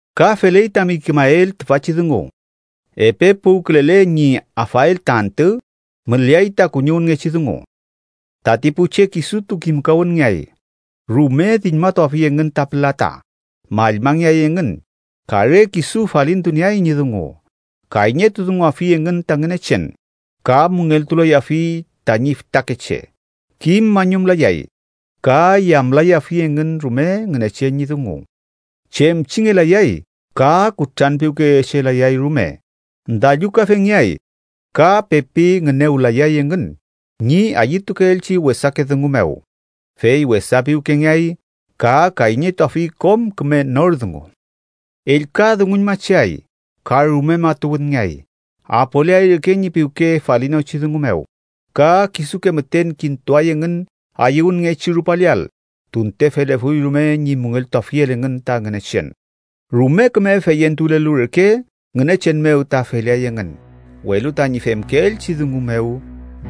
Ka feley tami kimael tüfachi dungu, epe puwkülele ñi afael ta antü müleay ta kuñiwünngechi dungu. Tati pu che kisutu kimkawünngeay, rume diñmatuafi engün ta pülata, mallmangeay engün ka re kisu falintunieay ñi dungu. Kayñetudunguafi engün ta Ngünechen, ka müngeltulayafi tañi fütakeche, kim mañumlayay ka yamlayafi engün rume Ngünechen ñi dungu. Chemchingelayay ka kutranpiwkeyechelayay rume, dallukafengeay ka pepi ngünewlayay engün ñi ayütukeelchi wesake dungu mew, fey wesa piwkengeay ka kayñetuafi kom küme nor dungu. Ellka dunguñmacheay ka rume matuwünngeay, apoleay reke ñi piwke falinochi dungu mew ka kisuke müten kintuay engün ayüwünngechi rupaleael tunte felefuy rume ñi müngeltuafiel engün ta Ngünechen. Rume küme feyentulelu reke Ngünechen mew ta feleay engün, welu tañi femkeelchi dungu mew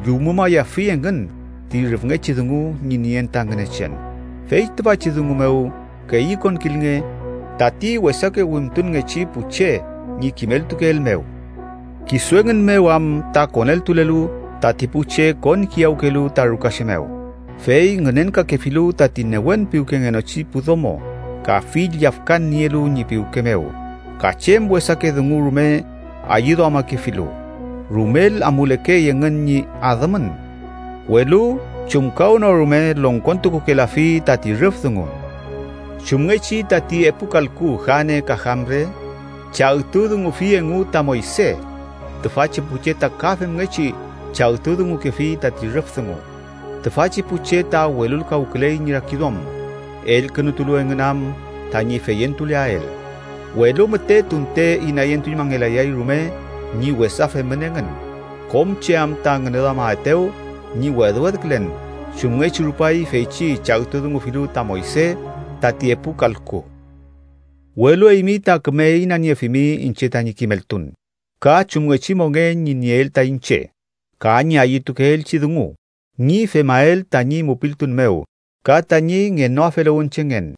llumumayafi engün ti rüfngechi dungu ñi nien ta Ngünechen. Fey tüfachi dungu mew keyükonkilnge tati wesake wimtunngechi pu che ñi kimeltukeel mew. Kisu engün mew am ta koneltulelu tati pu che konkiyawkelu ta rukache mew, fey ngünenkakefilu tati newen piwkengenochi pu domo ka fill yafkan nielu ñi piwke mew ka chem wesake dungu rume ayüduamakefilu, rumel amulekey engün ñi adümün, welu chumkawnorume longkontukukelafi tati rüf dungu. Chumngechi tati epu kalku Jane ka Jambre chagtudungufi engu ta Moyse, tüfachi pu che ta ka femngechi chagtudungukefi tati rüf dungu. Tüfachi pu che ta welulkawküley ñi rakiduam, elkünutulu engün am tañi feyentuleael. Welu müte tunte inayentuñmangelayay rume ñi wesa femün engün, kom che am ta ngüneduametew ñi wedwedkülen, chumngechi rupay feychi chagtudungufilu ta Moyse tati epu kalku. Welu eymi ta küme inaniefimi iñche tañi kimeltun, ka chumngechi mongen ñi nieel ta iñche, ka ñi ayütukeelchi dungu ñi femael tañi mupiltun mew, ka tañi ngenoafeluwünchengen,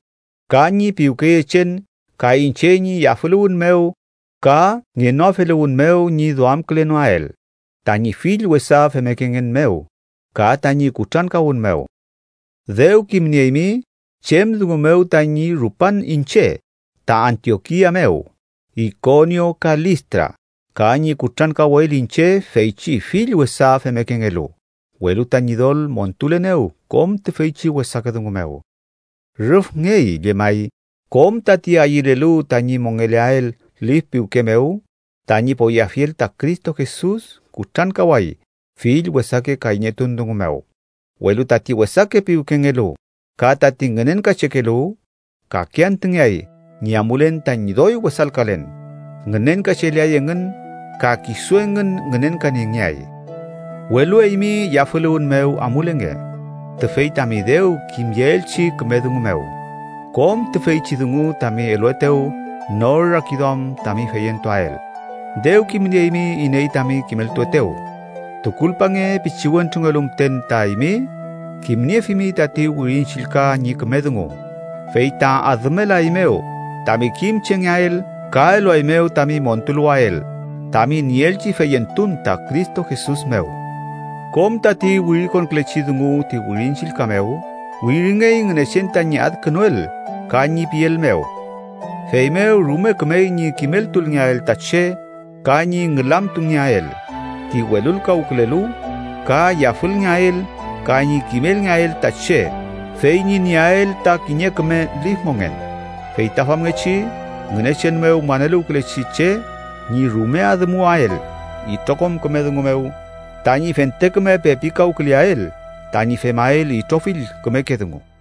ka ñi piwkeyechen ka iñche ñi yafüluwün mew ka ngenoafeluwün mew ñi duamkülenoael tañi fill wesa femmekengen mew ka tañi kutrankawün mew. Dew kimnieymi chem dungu mew tañi rupan iñche ta Antiokia mew, Ikonio ka Listra, ka ñi kutrankawel iñche feychi fill wesa femmekengelu, welu ta Ñidol montulenew kom tüfeychi wesake dungu mew. Rüfngey llemay kom tati ayülelu tañi mongeleael lif piwke mew tañi poyeafiel ta Cristo Jesus kutrankaway fill wesake kayñetun dungu mew, welu tati wesake piwkengelu ka tati ngünenkachekelu kake antüngeay ñi amulen tañi doy wesalkalen, ngünenkacheleay engün ka kisu engün ngünenkaniengeay. Welu eymi, yafüluwün mew amulenge tüfey tami dew kimyeelchi küme dungu mew, kom tüfeychi dungu tami eluetew nor rakiduam tami feyentuael. Dew kimnieymi iney tami kimeltuetew. Tukulpange pichiwentrungelu müten ta eymi kimniefimi tati Wirin Chillka ñi küme dungu, fey ta adümelaeymew tami kimchengeael ka eluaeymew tami montuluwael tami nieelchi feyentun ta Cristo Jesus mew. Kom tati wirikonkülechi dungu ti Wirin Chillka mew wiringey Ngünechen tañi adkünuel ka ñi piel mew, feymew rume kümey ñi kimeltulngeael ta che ka ñi ngülamtungeael ti welulkawkülelu, ka yafülngeael ka ñi kimelngeael ta che, fey ñi nieael ta kiñe küme lif mongen. Fey ta famngechi Ngünechen mew maneluwkülechi che ñi rume adümuwael itrokom küme dungu mew tañi fente küme pepikawküleael tañi femael itrofill kümeke dungu.